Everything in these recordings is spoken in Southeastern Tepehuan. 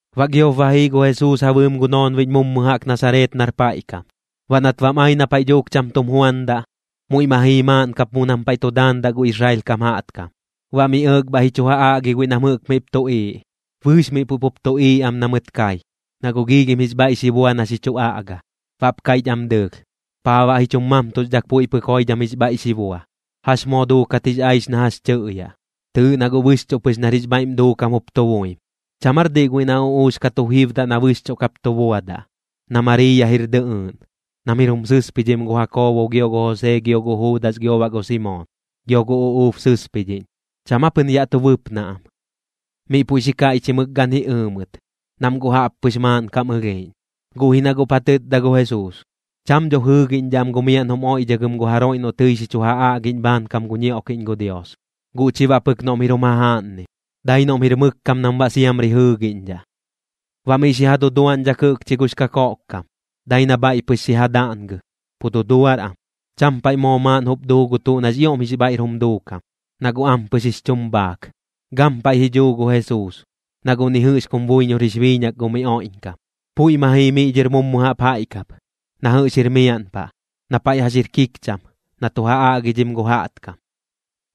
Baꞌ giop ba jii gu Jesuus ja bɨɨm gu noonbiꞌñ mummu jaꞌk Nasareet nar paiꞌ kam. Baꞌ nat bam ai na paiꞌ dhuuk cham tum juandaꞌ, muiꞌ ma jii maaꞌn kap mu nam paiꞌ tu daandaꞌ gu Israel kam jaꞌtkam. Baꞌ miꞌ ɇɇk bhaiꞌ ji chu ja aꞌgi guiꞌ nam jɨꞌk miꞌp tuꞌiiꞌ. Bɨɨx miꞌ puiꞌ pup tuꞌiiꞌ am na mɨt kai, na guꞌ giilhim jix bhaiꞌ xi bua na xi chu aꞌga. Baꞌp kaiꞌch am dɨɨlh: ―¿Paa baꞌ ji chum mamtuxdhak puiꞌ pɨk joidham jix bhaiꞌ xi bua? ¿Jax moo duukat jix aix na jax tɨꞌyaꞌ? Tɨɨꞌ na guꞌ bɨxchuꞌ pɨx nar jix bhaiꞌm duukam jup tu buim. ¿Cham aar diꞌ guiꞌ na uꞌuux ka tu jibdaꞌ na bɨxchuꞌ kap tu buadaꞌ, na Mariiya jir dɨꞌɨɨꞌn, nam jir jum sɨspidhim gu Jakoobo gio gu Josee gio gu Juudas gio baꞌ gu Simoon? Gio gu uꞌuub sɨspidhiꞌñ, ¿cham aa pɨn yaꞌ tu bɨpnaꞌ am? Miꞌ puiꞌ xi kaiꞌchimɨk gan ji ɨɨ mɨt, nam guꞌ jaꞌppɨx maaꞌnkam ɨlhiiꞌñ. Guꞌ ji na guꞌp ja tɨtda gu Jesuus: ―Cham dho jɨɨgiꞌñdhaꞌ am gu miaꞌn jum oiꞌdhagɨm gu jaroiꞌ noꞌ tɨi xi chu ja aꞌgiꞌñ bhaankam gu ñioꞌkiꞌñ gu Dios, guꞌ chi baꞌ pɨk noꞌm jir jum jajaꞌnnim. Dai noꞌm jir mɨk kam nam baꞌ siamri jɨɨgiꞌñdhaꞌ. Baꞌ miꞌ xi ja duduaꞌñdhak jɨꞌkchi gux kakoꞌkkam, dai na bhaiꞌ pɨx xi ja daꞌngɨ, pu duduar am. Cham paiꞌ moo maaꞌn jup duu gu tuꞌ nax ioꞌm jix bhaiꞌr jum duukam, na guꞌ ampɨx jix chum bhaak. Gampaiꞌ ji dhuu gu Jesuus, na guꞌ ni jɨꞌx kum buiñor jix biiñak gu miꞌ oiꞌñkam. Puiꞌ ma jii miꞌ dhɨr mummu jaꞌp jaiꞌ kap, na jɨꞌx jir miaꞌn paꞌ, na paiꞌ jax jir kikcham, na tu ja aꞌgidhim gu jaꞌtkam.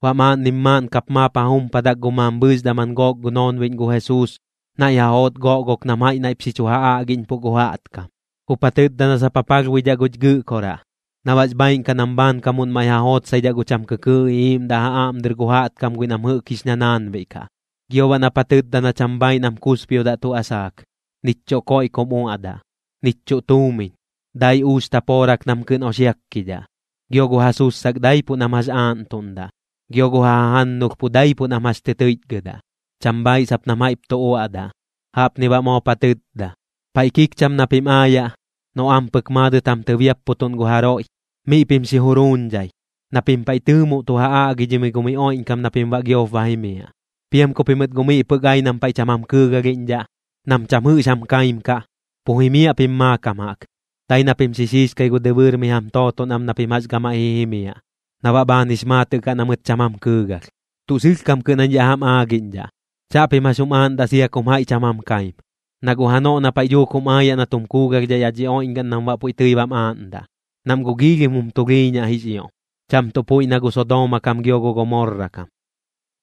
Baꞌ maaꞌnnim maaꞌn kap maap ja jumpadak gu mambhɨɨx daman gook gu noonbiꞌñ gu Jesuus, naiꞌ ja joot goꞌgok nam jaiꞌ naiꞌp xi chu ja aꞌgiꞌñpuꞌ gu jaꞌtkam. Jup ja tɨtda na sap ja palhbuidhaꞌ guch Gɨꞌkoraꞌ, na baꞌx bhaaiꞌn kaꞌ nam bhaankamuꞌn maiꞌ ja jootsaidhaꞌ gu cham kɨkɨɨꞌ iꞌiiꞌmdaꞌ ja aꞌm dɨr gu jaꞌtkam guiꞌ nam jɨꞌk jix ñanaanbiꞌ kaꞌ. Gio baꞌ nap ja tɨtda na cham bhaaiꞌ nam kusbiodaꞌ tuꞌ asaak, nich chuꞌ koiꞌ kum uaꞌdaꞌ, nich chuꞌ tuumiñ, dai uux tapoorak nam kɨꞌn oxiakkidhaꞌ. Gio gu ja sussak daipuꞌ nam jax aaꞌntuꞌndaꞌ, gio gu ja jajannulh pu daipuꞌ nam jax tɨ tɨichgɨdaꞌ, cham bhaaiꞌ sap nam jaiꞌp tu uaꞌdaꞌ. Jaꞌpni baꞌ moop ja tɨtda: ―Paiꞌ kikcham na pim aayaꞌ, noꞌ ampɨk maadɨt jam tɨbiapputuꞌn gu jaroiꞌ, miꞌ pim xi juruuñdhai, na pim paiꞌ tɨɨmuꞌ tu ja aꞌgidhimɨi gu miꞌ oiꞌñkam na pim baꞌ giop ba jimiaꞌ. Piam ku pimɨt guꞌ miꞌ pɨk ai nam paiꞌ cham jam kɨɨgalhiꞌñdhaꞌ, nam cham jɨꞌx jam kaim kaꞌ, pu jimiaꞌ pim maakam jaꞌk, dai na pim xi xiixkai gu dɨbɨɨr mi jam tooton am na pim jax gamaiꞌ ji jimiaꞌ, na baꞌ bhaan jix maatɨꞌ kaꞌ na mɨt cham jam kɨɨgalh. Tuꞌ sɨlhkam kɨꞌn jañ yaꞌ jam aagiꞌñdhaꞌ, chaꞌpim jax jum aaꞌndaꞌ sia kum jaiꞌ cham jam kaim. Na guꞌ janoꞌ na paiꞌ dhuuk jum aayaꞌ na tum kuugalhdhaꞌ yaꞌ dhi oiꞌñgaꞌn nam baꞌ puiꞌ tɨi bam aaꞌndaꞌ, nam guꞌ giilhim jum tulhiiñaꞌ jix ioꞌm, cham tuꞌ puiꞌ na gu Sodooma kam gio gu Gomorra kam.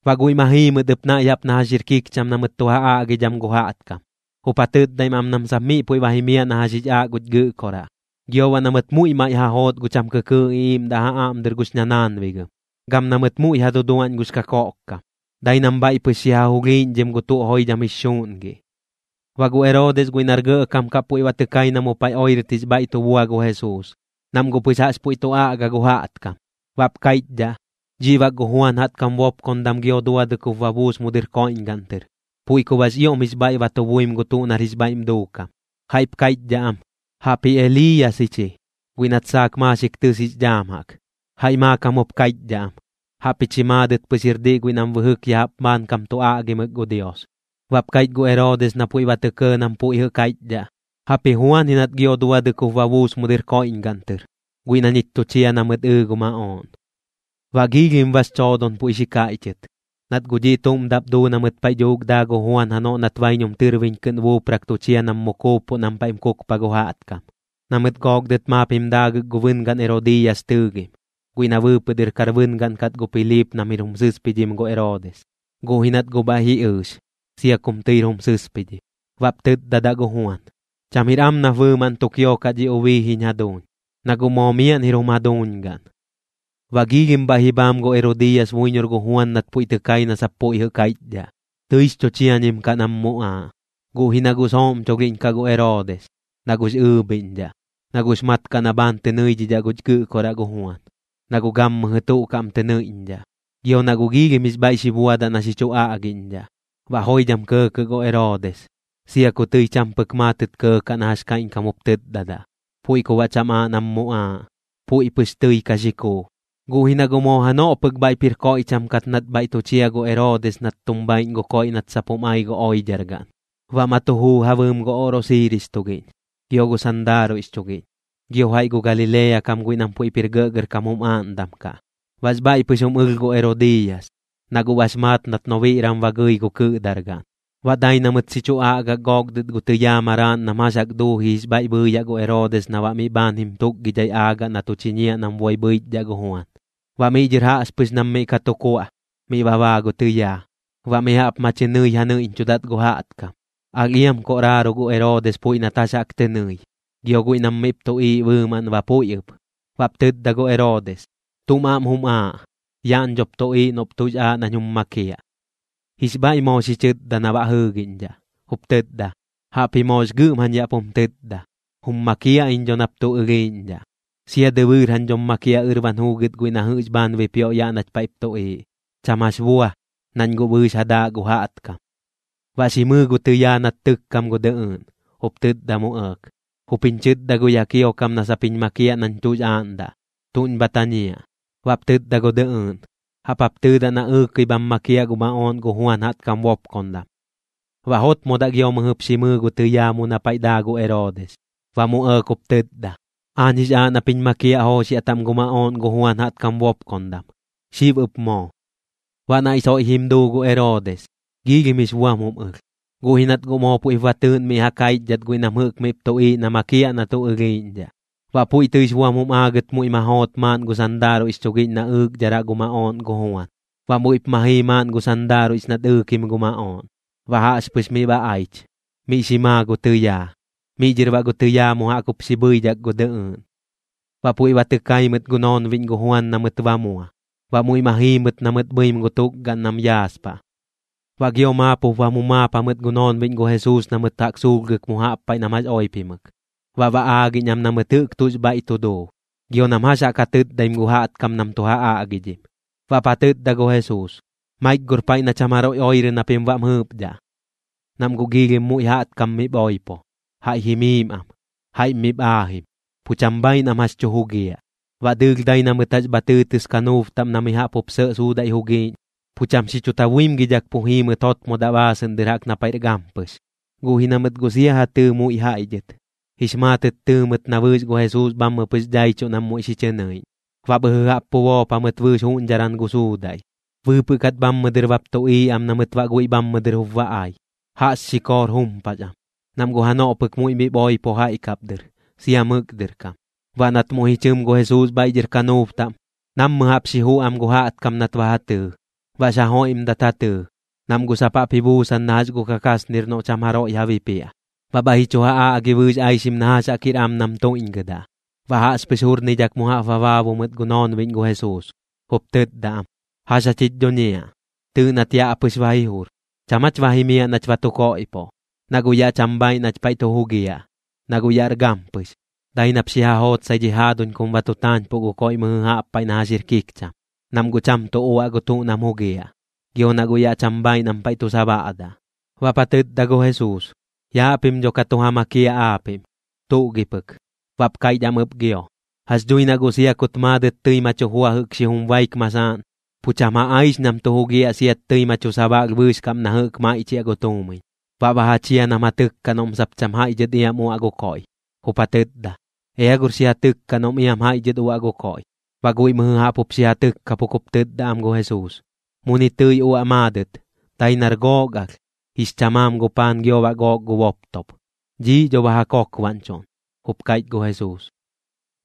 Baꞌ guiꞌ ma jii mɨt ɨp naiꞌ jaꞌp na jax jir kikcham na mɨt tu ja aꞌgidham gu jaꞌtkam, jup ja tɨtdaim am nam sap miꞌ puiꞌ ba jimiaꞌ na jax jix aaꞌ guch Gɨꞌkoraꞌ. Gio baꞌ na mɨt muiꞌ maiꞌ ja joot gu cham kɨkɨɨꞌ iꞌiiꞌmdaꞌ ja aꞌm dɨr gux ñanaanbigɨm, gam na mɨt muiꞌ ja duduaꞌñ gux kakoꞌkkam, dai nam bhaiꞌ pɨx xi ja julhiiꞌñdhim gu tuꞌ joidham jix xuuꞌngiꞌ. Baꞌ gu Eroodis guiꞌ nar gɇꞌkam kaꞌ puiꞌ ba tɨ kai na mu paiꞌ oirɨt jix bhaiꞌ tu bua gu Jesuus, nam guꞌ pɨx jaꞌx puiꞌ tu aꞌga gu jaꞌtkam. Baꞌp kaiꞌchdhaꞌ: ―Dhiꞌ bak gu Juan jaꞌtkam bopkondam gio duadɨk jup ba buus mu dɨr koiꞌñgaꞌn tɨr, puiꞌ ku baꞌx ioꞌm jix bhaiꞌ ba tu buim gu tuꞌ nax bhaiꞌr jum duukam. Jaiꞌp kaiꞌchdhaꞌ am: ―Jaꞌpji Eliiyas ji chi, guiꞌ nat saak maaxik tɨs jix dhaam jaꞌk. Jaiꞌ maakam jup kaiꞌchdhaꞌ am: ―Jaꞌpji chi maadɨt pɨx jir diꞌ guiꞌ nam bɨjɨk ya jaꞌp bhaankam tu aꞌgimɨk gu Dios. Baꞌp kaiꞌch gu Eroodis na puiꞌ ba tɇ kɇɇ nam puiꞌ jɨꞌ kaiꞌchdhaꞌ: ―Jaꞌpji Juan ji nat gio duadɨk jup ba buus mu dɨr koiꞌñgaꞌn tɨr, guiꞌ na ñich tu chia na mɨt ɨɨ gu maꞌooꞌn. Baꞌ giilhim bax choodon puiꞌ xi kaiꞌchɨt, nat guꞌ dhiꞌ tuꞌm daꞌp duu na mɨt paiꞌ dhuuk daa gu Juan janoꞌ nat baiñum tɨrbiñ kɨꞌn buuprak tu chia nam mu kuuppuꞌ nam paiꞌm kukpa gu jaꞌtkam, na mɨt gook dɨt maap jim daagɨk gu bɨngaꞌn Erodiiyas tɨɨgim, guiꞌ na bɨɨpɨꞌ dɨr kar bɨngaꞌn kat gu Piliip nam jir jum sɨspidhim gu Eroodis, guꞌ ji nat guꞌ bhaiꞌ ji ɨɨx, sia kum tɨir jum sɨspidhim. Baꞌp tɨtdadaꞌ gu Juan: ―Cham jir am nap bɨɨmaꞌn tu kiokaꞌ dhi ubii jiñ jaduuñ, na guꞌ moo miaꞌn jir jum jaduuñ gaꞌn. Baꞌ giilhim bhaiꞌ ji bhaam gu Herodiiyas buiñor gu Juan nat puiꞌ tɨ kai na sap puiꞌ jɨꞌ kaiꞌchdhaꞌ, tɨix chu chiañim kaꞌ nam muꞌaaꞌ. Guꞌ ji na guꞌ sooꞌmcholhiꞌñkaꞌ gu Eroodis, na guꞌx ɨɨbhiꞌñdhaꞌ, na guꞌx mat kaꞌ na bhaan tɨ nɨiꞌñdhaꞌ guch Gɨꞌkoraꞌ gu Juan, na guꞌ gammɨjɨ tuꞌ kaꞌm tɨ nɨiꞌñdhaꞌ, gio na guꞌx ioꞌm jix bhaiꞌ xi buadaꞌ na xi chu aꞌgiꞌñdhaꞌ. Baꞌ joidham kɇɇkɇꞌ gu Eroodis, sia ku tɨi cham pɨk maatɨt kɇɇkaꞌ na jax kaiꞌñkam jup tɨtdadaꞌ, puiꞌ ku baꞌ cham aaꞌ nam muꞌaaꞌ, puiꞌ pɨx tɨi ka xi kuu. Guꞌ ji na guꞌ moo janoꞌ pɨk bhaiꞌp jir koiꞌcham kat nat bhaiꞌ tu chia gu Eroodis nat tum bhaiꞌñ gu koiꞌ nat sap jum ai gu oidhargaꞌn. Baꞌ ma tu juu ja bɨɨm gu oꞌrosiiris tugiꞌñ, gio gu sandaaruiꞌx chugiꞌñ, gio jaiꞌ gu Galilea kam guiꞌ nam puiꞌp jir gɇꞌgɇrkam jum aaꞌndam kaꞌ. Baꞌx bhaiꞌ pɨx jum ɨlh gu Herodiiyas, na guꞌ bax maat nat noonbiran ba gɨi gu kɨꞌdargaꞌn. Baꞌ dai na mɨt xi chu aꞌgak gook dɨt gu tɨyaa maraaꞌn nam jax jaꞌk duuji jix bhaiꞌ bhɨɨyaꞌ gu Eroodis na baꞌ miꞌ bhaan jim tukgidhai aagaꞌ na tu chiñiaꞌ nam boi bhɨichdhaꞌ gu Juan. Baꞌ miꞌ dhɨr jaꞌxpɨx nam miꞌ ka tu kuaꞌ, miꞌ ba baa gu tɨyaa, baꞌ mi jaꞌp ma chɨ nɨi ja nɨiꞌñchudat gu jaꞌtkam. Alh iam koꞌraaru gu Eroodis puiꞌ nat jax jaꞌk tɨ nɨi, gio guiꞌ nam miꞌp tuꞌiiꞌ bɨɨmaꞌn ba puiꞌ ɨp. Baꞌp tɨtda gu Eroodis: ―¿Tuꞌm aꞌm jum aaꞌ? Yaꞌñ dhop tuꞌiiꞌ noꞌp tuꞌx aaꞌ nañ jum makiaꞌ. Jix bhaiꞌ moo xi chɨtda na baꞌ jɨɨgiꞌñdhaꞌ, jup tɨtda: ―Jaꞌp ji moox gɨꞌm jañ yaꞌ pum tɨtda. Jum makiaꞌ iñ dho nap tuꞌ ɨlhiiꞌñdhaꞌ, sia dɨbɨɨr jañ dhom makiaꞌ ɨrban juugɨt guiꞌ na jɨꞌx bhaan bipioꞌ yaꞌ nach paiꞌp tuꞌiiꞌ. Cham jax bua, nañ guꞌ bɨɨx ja daaꞌ gu jaꞌtkam. Baꞌ xi mɨɨ gu tɨyaa nat tɨkkam gu dɨꞌɨɨꞌn, jup tɨtda mu ɇɇk: ―Jup jiñ chɨtda gu yaꞌ kiokam na sap jiñ makiaꞌ nañ tuꞌx aaꞌndaꞌ. ¿Tuꞌñ bha tañiaꞌ? Baꞌp tɨtda gu dɨꞌɨɨꞌn: ―Jaꞌp jap tɨɨdaꞌ na ɨɨkɨi bham makiaꞌ gu maꞌooꞌn gu Juan jaꞌtkam bopkondam. Baꞌ jotmodaꞌ gio mɨjɨp xi mɨɨ gu tɨyaa mu na paiꞌ daa gu Eroodis, baꞌ mu ɇɇk jup tɨtda: ―Aañ jix aaꞌ nap jiñ makiaꞌ jooxiaꞌ taꞌm gu maꞌooꞌn gu Juan jaꞌtkam bopkondam, xib ɨp moo. Baꞌ naiꞌ soiꞌ jim duu gu Eroodis, giilhim jix buam jum ɨlh. Guꞌ ji nat guꞌ moo puiꞌp ba tɨɨꞌn miꞌ ja kaichdhat guiꞌ nam jɨꞌk miꞌp tuꞌiiꞌ na makiaꞌ na tuꞌ ɨlhiiꞌñdhaꞌ. Baꞌ puiꞌ tɨix buam jim aagɨt muiꞌ ma joot maaꞌn gu sandaaruiꞌx chugiꞌñ na ɨɨkdharaꞌ gu maꞌooꞌn gu Juan. Baꞌ muiꞌp ma jii maaꞌn gu sandaaruiꞌx nat ɨɨkim gu maꞌooꞌn. Baꞌ jaꞌxpɨx miꞌ ba aich, miꞌ xi maa gu tɨyaa. Miꞌ dhɨr baꞌ gu tɨyaa mu jaꞌk jup xi bhɨidhak gu dɨꞌɨɨꞌn. Baꞌ puiꞌ ba tɨ kai mɨt gu noonbiꞌñ gu Juan na mɨt ba mua, baꞌ muiꞌ ma jii mɨt na mɨt bhɨim gu tukgaꞌn nam yaaspaꞌ. Baꞌ gio maap jup bam jumaap jamɨt gu noonbiꞌñ gu Jesuus na mɨt jaꞌk suulhgɨk mu jaꞌp paiꞌ nam jax oipimɨk, baꞌ ba aagiꞌñ am na mɨt jɨꞌk tuꞌx bhaiꞌ tu duu, gio nam jax jaꞌk ja tɨtdaim gu jaꞌtkam nam tu ja aꞌgidhim. Baꞌp ja tɨtda gu Jesuus: ―Maik gor paiꞌ na cham jaroiꞌ oirɨ na pim baꞌm jɨɨpdhaꞌ. Nam guꞌ giilhim muiꞌ jaꞌtkam miꞌp oipo, jaiꞌ jimiim am, jaiꞌm miꞌp aajim, pu cham bhaiꞌ nam jax tu jugiaꞌ. Baꞌ dɨɨlh dai na mɨt jax bha tɨɨtɨs kanuub taꞌm na mi jaꞌp jup sɇꞌ suudaiꞌ jugiiꞌñ, pu cham xi chu tabuimgidhak pu jii mɨt jotmodaꞌ baasɨꞌn dɨr jaꞌk na paiꞌr gampɨx. Guꞌ ji na mɨt guꞌ sia ja tɨɨ muiꞌ jaiꞌ dhɨt, jix maatɨt tɨɨ mɨt na bɨɨx gu Jesuus bhammɨ pɨx daichuꞌ nam muiꞌ xi chɨ nɨiꞌñ. Baꞌ bhɨjɨ jaꞌp pu boop jamɨt bɨɨx juꞌñdharan gu suudaiꞌ, bɨɨpɨꞌ kat bhammɨ dɨr bap tuꞌiiꞌ am na mɨt baꞌ guiꞌ bhammɨ dɨr jup ba ai. Jaꞌx xikoor jumpax am, nam guꞌ janoꞌ pɨk muiꞌ miꞌp oipo jaiꞌ kap dɨr, sia mɨk dɨr kam. Baꞌ nat muiꞌ ji chɨm gu Jesuus bhaiꞌ dhɨr kanuub taꞌm, nammɨ jaꞌp xi juꞌ am gu jaꞌtkam nat ba ja tɨɨ. Baꞌx ja joiꞌmdat ja tɨɨ, nam guꞌ sap jaꞌp ji buusan na jax gu kakasnir noꞌ cham jaroiꞌ ja bipiaꞌ. Baꞌ bhaiꞌ ji chu ja aꞌgi bɨɨx aixim na jax jaꞌk jir am nam tuiꞌñgɨdaꞌ. Baꞌ jaꞌxpɨx jurnidhak mu jaꞌp ba baabu mɨt gu noonbiꞌñ gu Jesuus, jup tɨtda am: ―¿Jax jach jich dhuñiaꞌ? Tɨɨꞌ nat yaꞌ pɨx ba ji jur. ¿Cham aach ba jimiaꞌ nach ba tu koiꞌpoꞌ? Na guꞌ yaꞌ cham bhaaiꞌ nach paiꞌ tu jugiaꞌ, na guꞌ yaꞌr gampɨx. Dai nap xi ja jootsai dhi jaaduñ kum ba tu taañpuꞌ gu koiꞌ mɨjɨ jaꞌp paiꞌ na jax jir kikcham, nam guꞌ cham tuꞌ uaꞌ gu tuꞌ nam jugiaꞌ, gio na guꞌ yaꞌ cham bhaaiꞌ nam paiꞌ tu sabaꞌdaꞌ. Baꞌp ja tɨtda gu Jesuus: ―Yaaꞌ pim dho ka tu ja makiaꞌ aapiꞌm. ¿Tuꞌ gi pɨk? Baꞌp kaiꞌch am ɨp gio: ―Jax dhui na guꞌ sia kut maadɨt tɨi ma chu jua jɨꞌk xijum baik masaaꞌn, pu cham ja aix nam tu jugiaꞌ siat tɨi ma chu sabaꞌlh bɨɨx kaꞌm na jɨꞌk maiꞌchiaꞌ gu tuumiñ. Baꞌ ba ja chia nam ja tɨkkaꞌ noꞌm sap cham jaiꞌ dhɨt iam uaꞌ gu koiꞌ, jup ja tɨtda: ―Ea gor xi ja tɨkka noꞌm iam jaiꞌ dhɨt uaꞌ gu koiꞌ. Baꞌ guiꞌ mɨjɨ jaꞌp jup xi ja tɨkkapuk jup tɨtda am gu Jesuus: ―Muni tɨi uaꞌ maadɨt, dai nar gook alh, jix chamaam gu paan gio baꞌ gook gu boptop. ―Dhiiꞌ dho ba ja kokbaꞌñchuꞌn ―jup kaiꞌch gu Jesuus.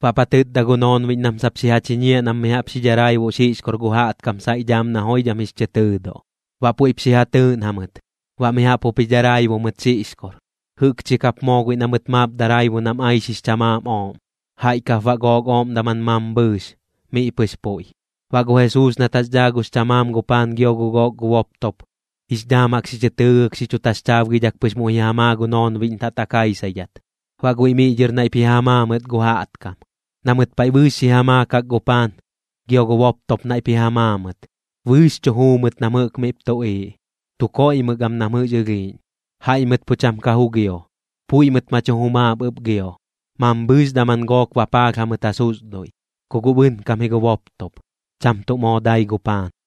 Baꞌp ja tɨtda gu noonbiꞌñ nam sap xi ja chiñiaꞌ nam mi jaꞌp xi dharaibuꞌ xiꞌxkor gu jaꞌtkam saiꞌ dhaam na joidham jix chɨ tɨɨduꞌ. Baꞌ puiꞌp xi ja tɨɨꞌn jamɨt, baꞌ mi jaꞌp jup ji dharaibu mɨt xiꞌxkor. Jɨꞌkchi kap moo guiꞌ na mɨt maap daraibu nam aix jix chamaam ooꞌm, jaiꞌ kap baꞌ gook ooꞌm daman mambhɨɨx, miꞌ pɨx puiꞌ. Baꞌ gu Jesuus nat jax dhaa gux chamaam gu paan gio gu gook gu boptop, jix dhaam jaꞌk xi chɨ tɨɨgɨk xi chu taxchaabgidhak pɨx muiꞌ ji ja maa gu noonbiꞌñ taꞌtak jaisaidhat, baꞌ guiꞌ miꞌ dhɨr naiꞌp ji ja maa mɨt gu jaꞌtkam. Na mɨt paiꞌ bɨɨx xi ja maakak gu paan, gio gu boptop naiꞌp ji ja maa mɨt. Bɨɨx chu juu mɨt nam jɨꞌk miꞌp tuꞌiiꞌ, tu koiꞌmɨk am nam jɨꞌx ɨlhiiꞌñ. Jaiꞌ mɨt pu cham ka jugio, puiꞌ mɨt ma chu jumaap ɨp gio, mambhɨɨx daman gook bapaalh jamɨt ja susduiꞌ, ku guꞌ bɨnkam ji gu boptop, cham tuꞌ moo dai gu paan.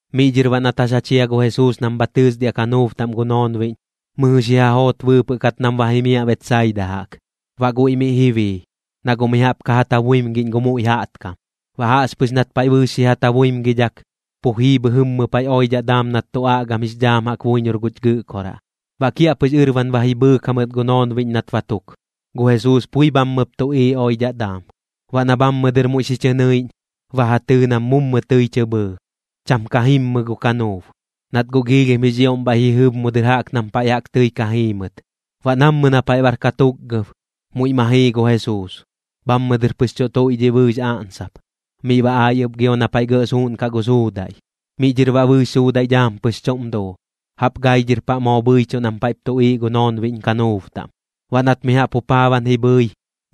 Miꞌ dhɨr baꞌ nat jax ja chia gu Jesuus nam bha tɨsdiaꞌ kanuub taꞌm gu noonbiꞌñ, mɨjɨ xi ja joot bɨɨpɨꞌ kat nam ba jimiaꞌ Betsaida jaꞌk. Baꞌ guiꞌ miꞌ ji bii, na guꞌ mi jaꞌp ka ja tabuimgiꞌñ gu muiꞌ jaꞌtkam. Baꞌ jaꞌxpɨx nat paiꞌ bɨɨx xi ja tabuimgidhak, pu jii bhɨjɨmmɨ paiꞌ oidhaꞌ daam nat tu aꞌgam jix dhaam jaꞌk buiñor guch Gɨꞌkoraꞌ. Baꞌ kiaꞌpɨx ɨrban ba ji bhɨɨk jamɨt gu noonbiꞌñ nat ba tuk, gu Jesuus pui bhammɨp tuꞌiiꞌ oidhaꞌ daam. Baꞌ na bhammɨ dɨr muiꞌ xi chɨ nɨiꞌñ, ba ja tɨɨ nam mummu tɨi tɨ bhɨɨ, cham ka jimmɨ gu kanuub, nat guꞌ giilhim jix ioꞌm bhaiꞌ ji jɨb mu dɨr jaꞌk nam paiꞌ jaꞌk tɨi ka jiimɨt. Baꞌ nammɨ na paiꞌ bar katukgab, muiꞌ ma jii gu Jesuus, bhammɨ dɨr pɨx tu tuiꞌdhiꞌ bɨɨx aꞌnsap, miꞌ ba ai ɨp gio na paiꞌ gɇꞌ suuꞌnkaꞌ gu suudaiꞌ. Miꞌ dhɨr baꞌ bɨɨx suudaiꞌ dhaam pɨx chuꞌm duu, jaꞌp gai dhɨr paꞌ moo bhɨichuꞌ nam paiꞌp tuꞌiiꞌ gu noonbiꞌñ kanuub taꞌm. Baꞌ nat mi jaꞌp jupaaban ji bhɨi,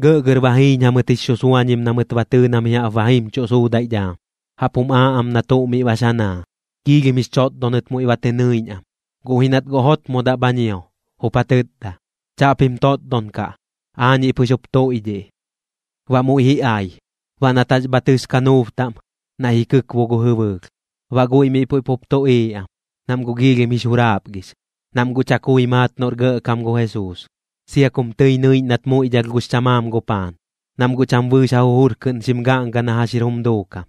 gɇꞌgɇr ba jiiñ jamɨt jix xusuañim na mɨt ba tɨɨ na mi jaꞌp ba jimchuꞌ suudaiꞌ dhaam. Jaꞌp jum aaꞌ am na tuꞌ miꞌ bax ja naa. Giilhim jix chotdonɨt muiꞌ ba tɨ nɨiꞌñ am, guꞌ ji nat guꞌ jotmodaꞌ bha ñio, jup ja tɨtda: ―¡Chaꞌpim totdon kaꞌ! ¡Aañiꞌ pɨx jup tuiꞌdhiꞌ! Baꞌ muiꞌ ji ai. Baꞌ nat jax bha tɨs kanuub taꞌm, naiꞌ ji kɨkbu gu jɨbɨlh. Baꞌ guiꞌ miꞌ puiꞌ pup tuꞌiiꞌ am, nam guꞌ giilhim jix juraapgix, nam guꞌ chakui maat noꞌr gɇꞌkam gu Jesuus, sia kum tɨi nɨiꞌñ nat muiꞌdhalh gux chamaam gu paan, nam guꞌ cham bɨɨx ja jujur kɨꞌn xim gaꞌnga na jax jir jum duukam.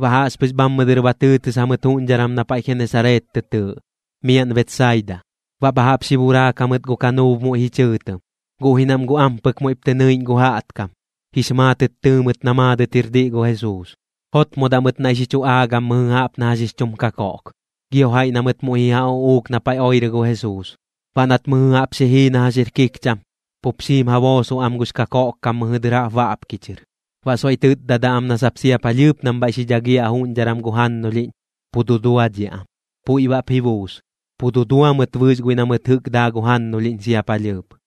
Baꞌ jaꞌxpɨx bhammɨ dɨr ba tɨɨtɨs jamɨt juꞌñdharan na paiꞌ Genesareet tɨ tɨɨꞌ, miaꞌn Betsaida. Baꞌ bha jaꞌp xi buraak jamɨt gu kanuub muiꞌ ji chɨɨtɨm. Guꞌ ji nam guꞌ ampɨk muiꞌp tɨ nɨiꞌñ gu jaꞌtkam, jix maatɨt tɨɨ mɨt na maadɨt jir diꞌ gu Jesuus. Jotmodaꞌ mɨt naiꞌ xi chu aagam mɨjɨ jaꞌp na jax jix chum kakoꞌk, gio jaiꞌ na mɨt muiꞌ ji ja uꞌuuk na paiꞌ oirɨ gu Jesuus. Baꞌ nat mɨjɨ jaꞌp xi jii na jax jir kikcham, pup xim ja boosoꞌ am gux kakoꞌkkam mɨjɨ dɨr jaꞌp baꞌpki chɨr, baꞌ soiꞌ tɨtdadaꞌ am na sap sia palhɨɨp nam bhaiꞌ xi dhagiaꞌ juꞌñdharan gu jannulhiꞌñ, pu duduadhiaꞌ am. Puiꞌ baꞌp ji buus, pu dudua mɨt bɨɨx guiꞌ na mɨt jɨꞌk daa gu jannulhiꞌñ sia gu palhɨɨp.